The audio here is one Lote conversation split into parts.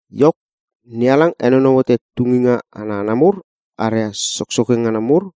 Iok, NeHalang henonou hote tunginga ana hana mur aria soksoke ngana mur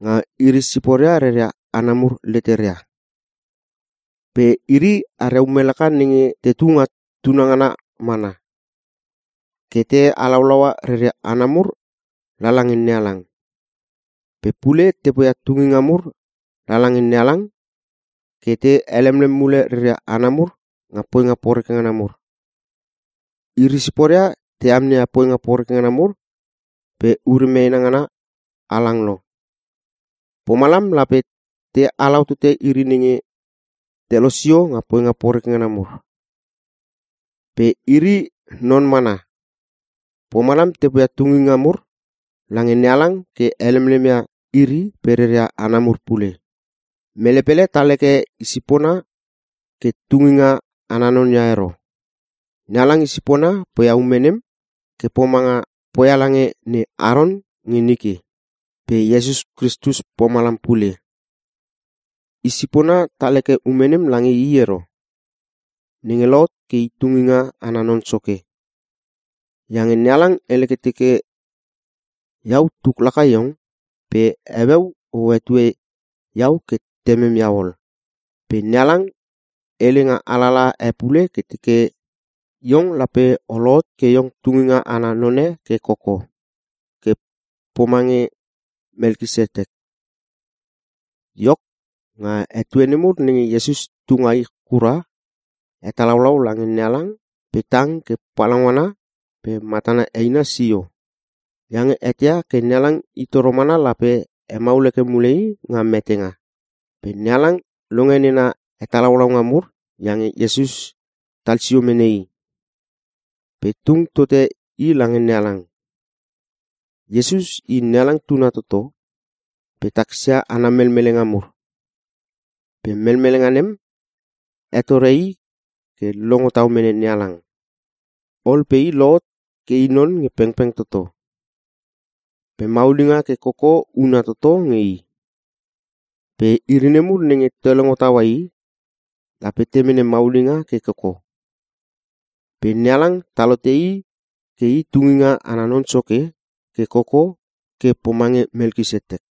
nga iri siporia reria hana mur leteria. Pe iri aria ume laka nenge tetu nga tuna ngana mana, ke te halaulaua reria hana mur lala nge NeHalang. Pe pule te poia tunginga mur lala nge NeHalang ke te helemlem mule reria hana mur nga poinga poreke ngana mur. Iri siporia te amneia poinga poreke ngana mur pe ure meena ngana halang lo, pomalam lape te halau tote iri nenge te losio nga poinga poreke ngana mur. Pe iri non mana, pomalam te poia tunginga mur lange NeHalang ke helemlem ia iri pe reria hana mur pule. Mele pele tal heke i sipona ke i tunginga ana non ia ero. NeHalang i sipona poia ume nem ke pomanga poia lange ne Aron nge nike. Pe Iesus Kristus pomalam pule. I sipona tal heke ume nem lange i ero, nenge lohot ke i tunginga ana non soke. Iange NeHalang hele ke teke, “Iau tuk laka iong pe heueu o hetue iau ke Temem iau ol.” Pe NeHalang hele nga alalaha e pule ke teke, “Iong lape o lohot ke iong tunginga ana none ke koko, ke pomange Melkisetek.” Iok, nga etue nemur nenge Iesus tu nga ich kura, hetalaulau lange NeHalang pe tang ke palaungana pe matana eina sio. Iange eteia ke NeHalang i toro mana lape hemaul heke mule i nga metenga. Pe NeHalang longe nena hetalaulaunga mur iange Iesus tal sio mene i, pe tung tote i lange NeHalang. Iesus I NeHalang tuna toto, pe takisia ana melmelenga mur. Pe melmelenga nem, hetore i ke longo tau mene NeHalang. Ol pe i lohot ke i non nge pengpeng toto, pe maulinga ke koko huna toto nge i. Pe iri nemur nenge te longo taua i, lape te mene maulinga ke koko. Pe NeHalang tal hote i ke i tunginga ana non soke ke koko ke pomange Melkisetek.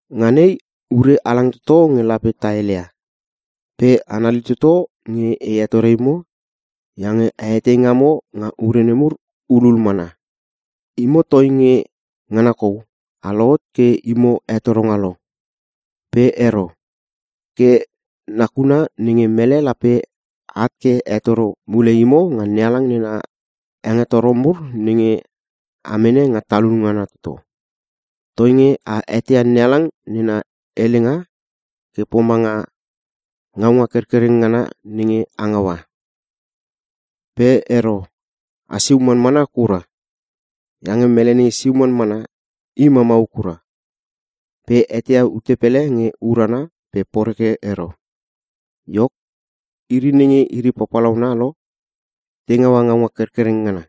Nga nei, ure halang toto nge lape ta heleia. Pe anali toto nge e hetore imo iange a etei ngamo nga ure mur hulul mana. Imo, toinge ngana kou a lohot ke imo hetoronga lo. Pe ero. Ke nakuna nenge mele lape at ke hetoro mule imo nga NeHalang nena hengetoro mur nenge a mene nga talun ngana toto. Toinge a eteia NeHalang nena helenga ke pomanga ngaunga kerkereng ngana nenge a ngaua. Pe ero! A siu manmana kura! Iange mele nenge siu manmana, i mamau kura. Pe eteia ute pele nge urana pe poreke ero. Iok, iri nenge iri papalauna lo te ngaua ngaunga kerkereng ngana.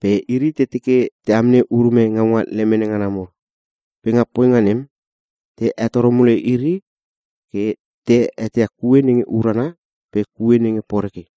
Pe iri te teke te amnei urume ngaunga lemene ngana mur. Pe nga poinga nem, te hetoro mule iri ke te eteia kue nenge urana pe kue nenge poreke.